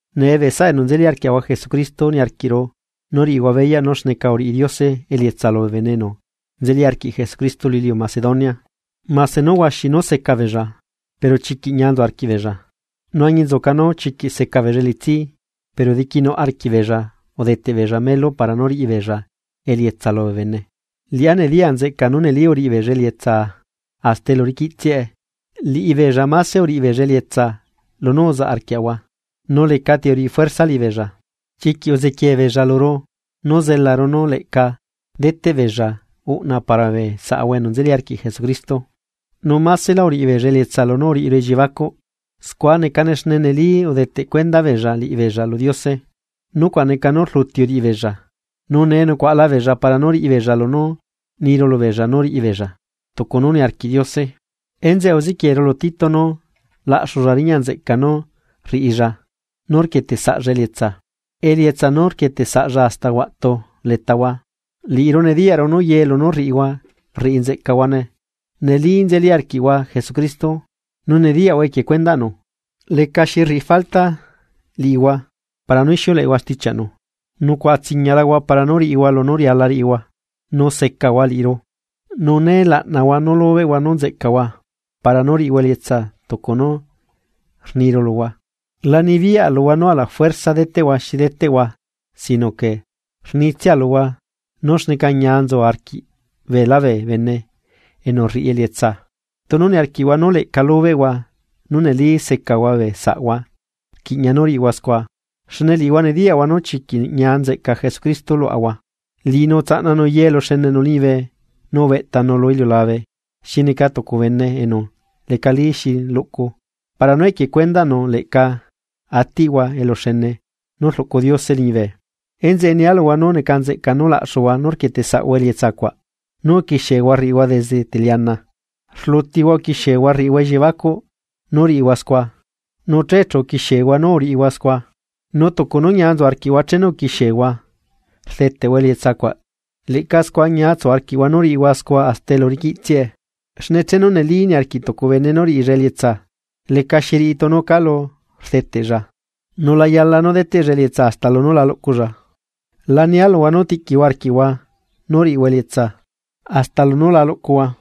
Nee bee saꞌa enu nzeli arquiaꞌahua Jesucristo niarquiꞌru nú riꞌihua beyaꞌ nú xneca uriꞌi Diose elietsa lubee bene enu nzeli arquiꞌ Jesucristo lu iliu Macedonia, mase nú huaxi nú seca beella, pero chiquiꞌ ñia nzu arquiꞌbeella. Nu añinzuca nú chiquiꞌ seca beella elitsi, pero diquinuꞌ arquiꞌ beella udeteꞌ beella melu para nú riꞌi beella elietsa lubee bene. Liꞌá nediya nzeꞌcaa nú neli uriꞌi beella elietsa hasta elu uriquiꞌtsiae. Liꞌibeella máse uriꞌi beella elietsa lunú uzaꞌ arquiaꞌahua, nu lecati uriꞌi fuerza liꞌibeella. Chiquiꞌ uzequiee beella luru nú zelaru nu leꞌca deteꞌbeella uꞌna para bee saꞌahua enu nzeli arquiꞌ Jesucristo Nu másela uriꞌi beella elietsa lunú uriꞌiru elliebacuꞌ, scua necane xne neli udeteꞌ cuenda beella liꞌibeella lu Diose, nucuaꞌ neca nú rluti uriꞌibeella. Nu nee nucuaꞌalabeella para nú riꞌibeella lunú niru lubeella nú riꞌibeella, tucu nú niarquiꞌ Diose. Enzeꞌe uzequieru lu Tito nú laꞌxulla riñaꞌnzeꞌca nú rriꞌilla nú rquieteꞌsaꞌlla elietsa, elietsa nú rquieteꞌsaꞌlla hasta huaꞌtu letahua. Liꞌiru nediyaꞌru nú ye lunú rriꞌihua rriꞌi nzeꞌcahuane nu neli nzeli arquiꞌhua Jesucristo, nu nediyaꞌhua equie cuendaꞌnu, lecaxi rriꞌi falta liꞌihua para nú ixiuleꞌehua stichiaꞌnu, nucuaꞌa tsiñialahua para nú riꞌihua lunú riala riꞌihua, nu secahua liꞌiru. Nu nee laꞌnahua nú lubeꞌhua nú nzeꞌcahua para nú riꞌihua elietsa tucu nú rniru luhua. La nibiyaꞌa luhua nú alafuerza deteꞌhua xi deteꞌhua sino que, rnitsia luhua nú xneca ñia nzu arquiꞌ beela bee bene enú rriꞌi elietsa. Tunu niarquiꞌhua nú leꞌca lubeꞌhua nú neli secahua bee saꞌhua. Rquiꞌña nú riꞌihua scua. Xne liꞌihua nediyaꞌhua nú chiquiꞌ ñia nzeꞌca Jesucristo luaꞌahua. Liꞌinu utsaꞌnanu ye eluxeneꞌnu liñibe nu ubeꞌtanu lu iliulabe xi neca tucu bene enu lecali xi luꞌcu, para nú equie cuendaꞌnu leꞌca atiꞌhua eluxene nú rluꞌcu Diose liñibe. Enzeꞌe nia luhua nú neca nzeꞌca nú laꞌxuhua nú rquieteꞌsaꞌhua elietsa cuaꞌ nú uquixiehua rriꞌihua desde teliana. Rlutihua uquixiehua rriꞌihua elliebacuꞌ nú riꞌihua scua, nu che chu uquixiehua nú uriꞌihua scua. Nu tucu nú ñia nzu arquiꞌhua chenu uquixiehua, rdeteꞌhua elietsa cuaꞌ leꞌca scua ñia tsu arquiꞌhua nú riꞌihua scua hasta elu riquiꞌtsiae. Xne chenu neli niarquiꞌ tucu bene nú riꞌilla elietsa, lecaxi riꞌi tunu calu rdeteꞌlla, nu la yala nú deteꞌlla elietsa hasta lunú la luꞌculla. Lania luhua nú tiꞌquihua arquiꞌhua nú riꞌihua elietsa hasta lunú la luꞌcuhua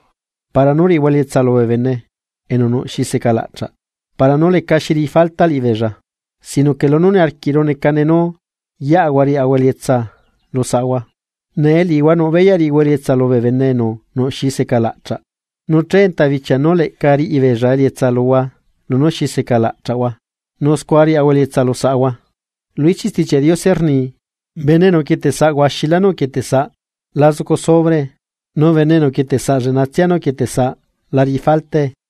para nú riꞌihua elietsa lubee bene enu nuꞌ xi secalaꞌchaꞌ. Para nú lecaxi riꞌi falta liꞌibeella, sinoque lunú niarquiꞌru necane nú yeꞌahua riaꞌahua elietsa lu saꞌahua. Nee liꞌihua nuꞌ beyaꞌ riꞌihua elietsa lubee bene enu nuꞌ xi secalaꞌchaꞌ, nu che enta bichia nú leꞌca riꞌi beella elietsa luhua lunú xi secalaꞌchaꞌhua, nu scua riaꞌahua elietsa lu saꞌahua. Lu ichiꞌ Stichiaꞌ Diose rni: “Bene enu uquieteꞌsaꞌ huaxilá nú uquieteꞌsaꞌ la zucu sobrae, nu bene enu uquieteꞌsaꞌ lleꞌnatsia nú uquieteꞌsaꞌ la riꞌi faltae.”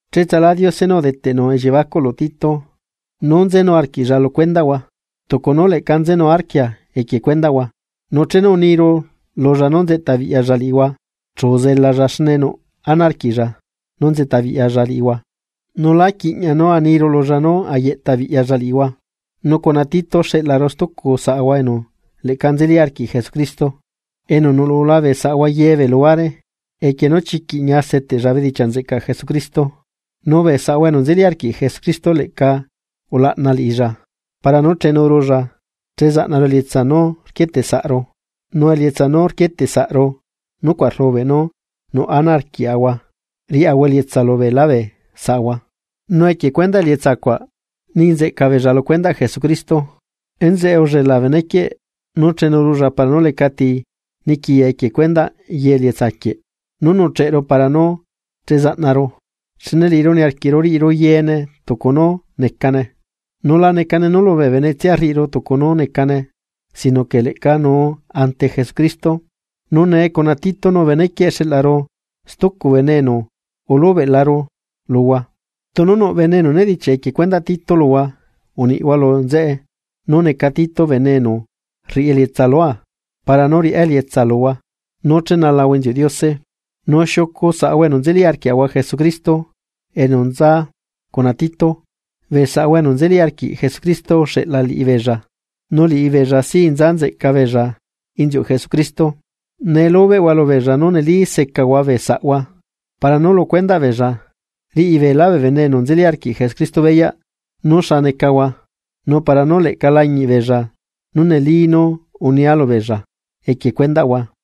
Cheꞌtsalá Diose nú udeteꞌnu elliebacuꞌ lu Tito nú nzenu arquiꞌlla lu cuendaꞌhua tucu nú leꞌca nzenu arquia equie cuendaꞌhua. Nu chenu uniru lulla nú nzeꞌtabiꞌyalla liꞌihua, chu uzelalla xne nuꞌ ana arquiꞌlla nú nzeꞌtabiꞌyalla liꞌihua, nu lá quiꞌña nú aniru lulla nú ayeꞌta biꞌyalla liꞌihua. Nu cuna Tito xeꞌlaru stucu saꞌahua enu leꞌca nzeli arquiꞌ Jesucristo, enu nuꞌlula bee saꞌahua ye bee luhuare, equie nú chiquiꞌ ñia seteꞌlla bedichiaꞌ nzeꞌcaꞌ Jesucristo. Nu bee saꞌahua enu nzeli arquiꞌ Jesucristo leꞌca ulaꞌna liꞌilla para nú chenurulla che zaꞌnaru elietsa nú rquieteꞌsaꞌru. Nu elietsa nú rquieteꞌsaꞌru nucuaꞌ rlubeꞌ nú nuꞌ ana arquiaꞌahua riaꞌahua elietsa lu beela bee saꞌahua. Nu equie cuendaꞌ elietsa cuaꞌ ni nzeꞌca beella lu cuendaꞌ Jesucristo. Enzeꞌe ullela benequieꞌ nú chenurulla para nú lecati niquiya equie cuendaꞌ ye elietsa quieꞌ nú nuꞌcheꞌru para nú chezaꞌnaru. Xne liꞌiru niarquiꞌru riꞌiru yee tucu nú necane, nu la neca nú lubee benetsia rriꞌiru tucu nú necane sino que leꞌca nuu ante Jesucristo. Nu nee cuna Tito nu benequieꞌ xeꞌlaru stucu bene enu ulubeꞌlaru luhua. Tunu nuꞌ bene enu nedichiaꞌ equie cuendaꞌ Tito luhua uniꞌhua lu nzeꞌe nú neca Tito bene enu rriꞌi elietsa lua, para nú riꞌá elietsa luhua, nú chenalahua inziuꞌ Diose. Nu xiucu saꞌahua enu nzeli arquiaꞌahua Jesucristo enu nza cuna Tito, bee saꞌahua enu nzeli arquiꞌ Jesucristo uxeꞌla liꞌibeella, nu liꞌibeella sí nza nzeꞌca beella inziuꞌ Jesucristo. Nee lubeꞌhua lubeella nú neli secahua bee saꞌahua, para nú lu cuendaꞌ beella riꞌi beelá bee bene enu nzeli arquiꞌ Jesucristo beyaꞌ nú xa necahua nu para nú leꞌca lañiꞌ beella nú neli nú unia lubeella equie cuendaꞌhua.